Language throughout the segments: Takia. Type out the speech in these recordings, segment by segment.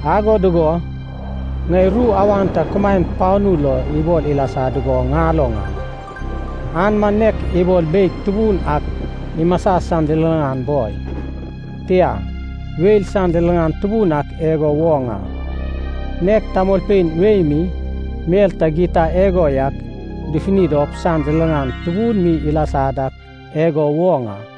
Ago dugo ŋai ru awan ta kumaen panu lo ibol ilasa dugo ŋaloŋ a. An man nek ibol beig tubun ak imasa san liliŋan boi, tia, weil san liliŋan tubun ak igo woŋ a. Nek tamolpein wei mi mel ta gita igo yak dufuni dop san liliŋan tubun mi ilasa dak igo woŋ a.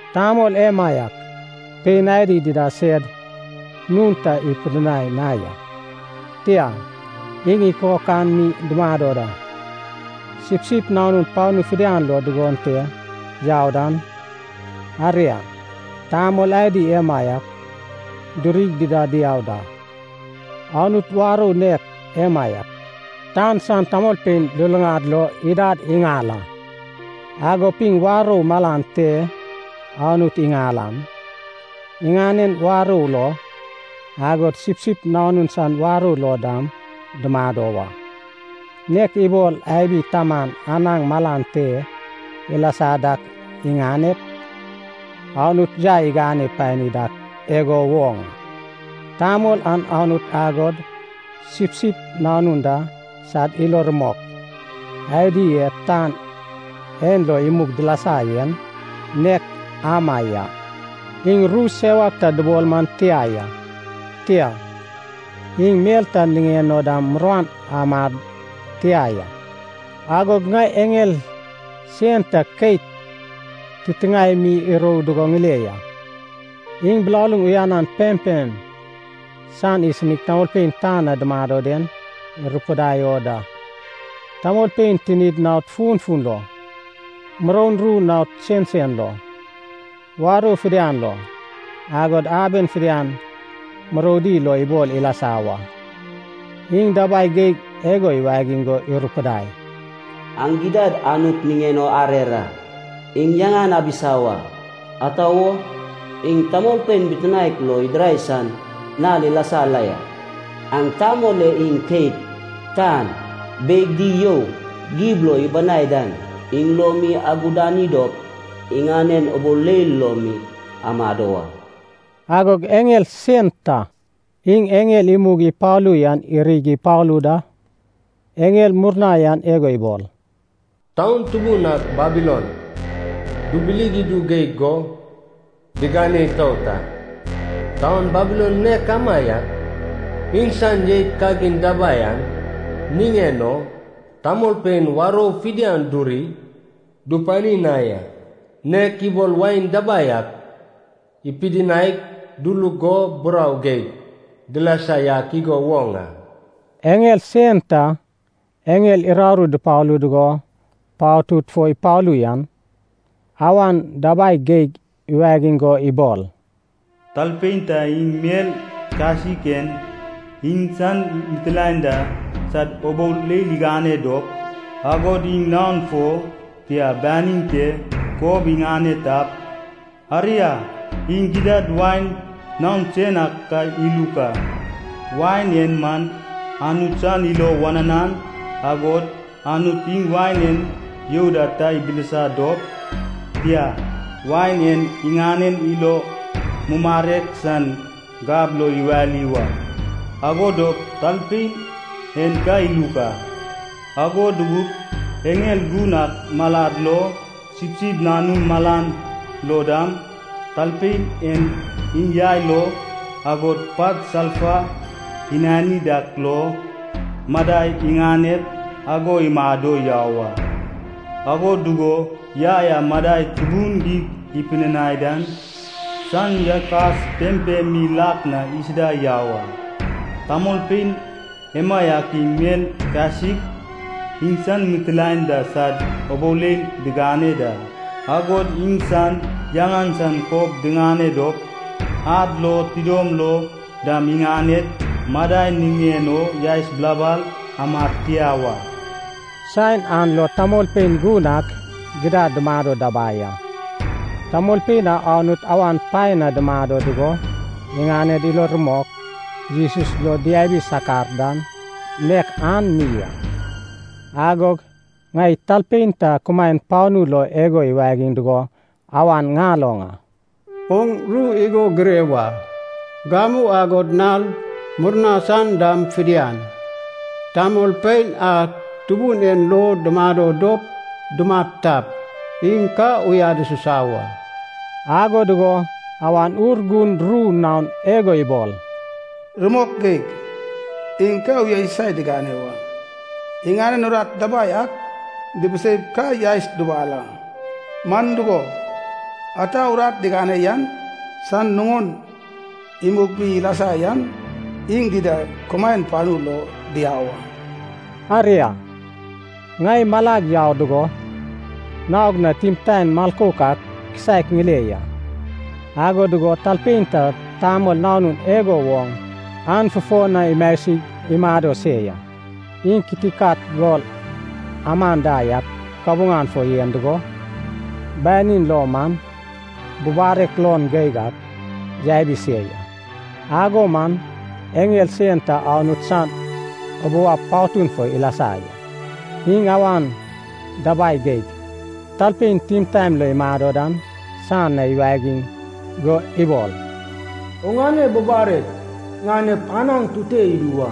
Tamol emaiak pein adi dida sed nun ta ipidinai na ya. Tia, iŋ ikokan mi dumado da. Sipsip Nanun panu fidian lo dugon te yau dan, aria, tamol adi emaiak durig dida diau da. Anut warou nek emaiak, tan san tamolpein luluŋad lo idad iŋal a. Agop iŋ warou malan te Anut iŋal an, iŋanen warou lo, agod Sipsip Nanun san warou lo dam dumado wa. Nek ibol abi taman anaŋ malan te ilasa dak iŋanep, Anut yai igane pani dak igo woŋ, tamol an Anut agod Sipsip Nanun da sad ilo rumok adi e tan en lo imug dilasa yen, nek ama ya. Iŋ ru sewak ta dubol man tia ya. Tia, iŋ mel ta niŋen o dam muruan amad tia ya. Agog ŋai eŋel sen ta keit titiŋae mi irou dugo ŋile ya. Iŋ bilaluŋ uyanan pempem san isinig tamolpein tan na dumado den irupidai o da. Tamolpein tinid naod funfun lo, muroun ru naon sensen lo, warou fidian lo, agod aben fidian muroudi lo ibol ilasa wa. Iŋ dabai geig igo iwagiŋ go irupidai, “Aŋ gidad Anut niŋen o arer a! Iŋ yaŋan abisa wa! Ata wo? Iŋ tamolpein bitinaek lo idirai san nal ilasa la ya. Aŋ Tamol e iŋ keit, tan, beig di you gib lo ibanai dan dam idirai en, iŋ lo mi agudani dop iŋanen ubou leil lo mi amado wa.” Agog eŋel sen ta, iŋ eŋel imug ipalu yan irig ipalu da. Eŋel murna yan igo ibol, “Taun tubun ak Babilon dubilig idu geig go digane itout a. Taun Babilon nek amaiak, iŋsan jeit kagin dabai an niŋen o, tamolpein warou fidian duri dupani na ya. Nek ibol wain dabai ak ipidinaig duluk go burau geig dilasa yak igo woŋ a.” Eŋel sen ta eŋel uraru dupalu dugo patud fo ipalu yan, awan dabai geig iwagiŋ go ibol, “Talpein ta iŋ mel kasik en iŋsan mitilaen da sad ubou leil igane dop, agod iŋ naon fo, tia, banin te, kob iŋane tap, aria, iŋ gidad wain naon sen ak ka iluk a. Wain en man Anut san ilo wananan agod Anut iŋ wain en you da ta ibilisa dop, tia, wain an iŋanen ilo mumarek san gab lo iwali wa. Ago dop talpein en ka iluk a. Ago dugup eŋel gun ak malad lo, Sipsip Nanun malan lo dam, talpein en iŋ yai lo, agod pat salfa inani dak lo, madai iŋanep ago imado yau a. Ago dugo yai a madai tubun geig ipidinai dan san yakas pempem mi lak na isuda yau a. Tamolpein emaiak iŋ mel kasik, iŋsan mitilaen da sad ubou leil digane da, agod iŋsan yaŋan san kob diŋane dop, ad lo tidom lo dam iŋaned madai niŋen o yaes bilabal amad tia wa.” Saen an lo tamolpein gun ak gidad dumado dabai a. Tamolpein a Anut awan paen na dumado dugo iŋaned ilo rumok Jesus lo diabi sakar dan nek an mi a. Agog ŋai talpein ta kumaen panu lo igo iwagiŋ dugo awan ŋaloŋ a. “Oŋ ru igo gire wa. Gamu agod nal murna san dam fidian, tamolpein a Tubun en lo dumado dop dumat tap, iŋ ka uyad isusa wa.” Ago dugo Awan Urgun ru naon igo ibol, “Rumok geig, iŋ ka uyasusai digane wa. Iŋanen urat dabai ak dibiseip ka yaes dubal a. Man dugo, ata urat digane yan san nuŋon imug mi ilasa yan iŋ dida kumaen panu lo diau a.” Aria, ŋai malag yau dugo, naog na timtaen milkouk ak kisaek ŋile ya. Ago dugo talpein ta tamol nanun igo woŋ an fufo na imasig imado se ya. Iŋ kitikat gol aman da yak kabuŋan fo yen dugo, banin lo man bubarek luon geig ak yabi se ya. Ago man eŋel sen ta Anut san ubou ab patun fo ilasa ya. Iŋ awan dabai geig talpein timtaen lo imado dan san na iwagiŋ go ibol, “Oŋane bubarek ŋanep anaŋ tute idu wa.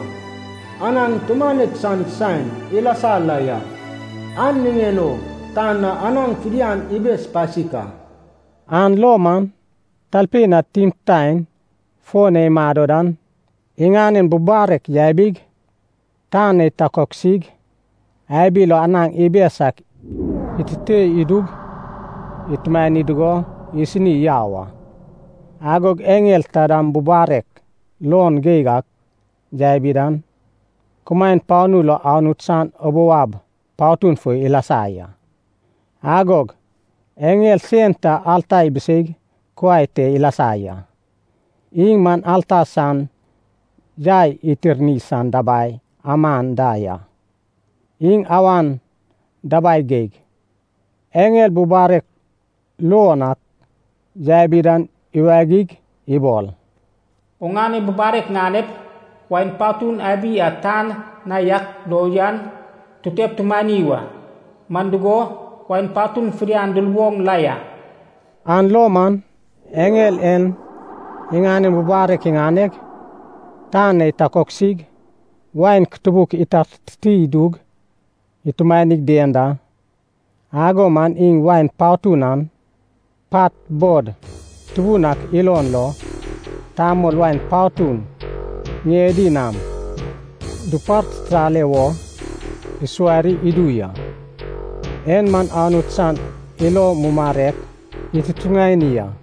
Anaŋ tumanek san saen ilasa la ya, an niŋen o tan na anaŋ fidian ibes pasik a.” An lo man talpein a timtaen fo na imado dan, iŋanen bubarek yabig, tan na itakoksig abi lo anaŋ ibes ak itute idug itumani dugo isini yau a. Agog eŋel taidam bubarek luon geig ak yabi dan, kumaen panu lo Anut san ubou ab patun fo ilasa ya. Agog eŋel sen ta alta ibiseig kuai te ilasa ya. Iŋ man alta san yai itirni san dabai aman da ya. Iŋ awan dabai geig eŋel bubarek luon ak yabi dan iwagig ibol, “Oŋane bubarek ŋanep, wain patun abi a tan na yak lo yan tutep tumani wa. Man dugo, wain patun fidian duluboŋ la ya.” An lo man eŋel en iŋanen bubarek iŋaneg, tan na itakoksig, wain kutubuk itartiti idug itumanig dien da. Ago man iŋ wain patun an, pat bod tubun ak ilon lo tamol wain patun ŋiedi nam dupartitale wo isuwari idu ya. En man Anut san ilo mumarek itutuŋani a.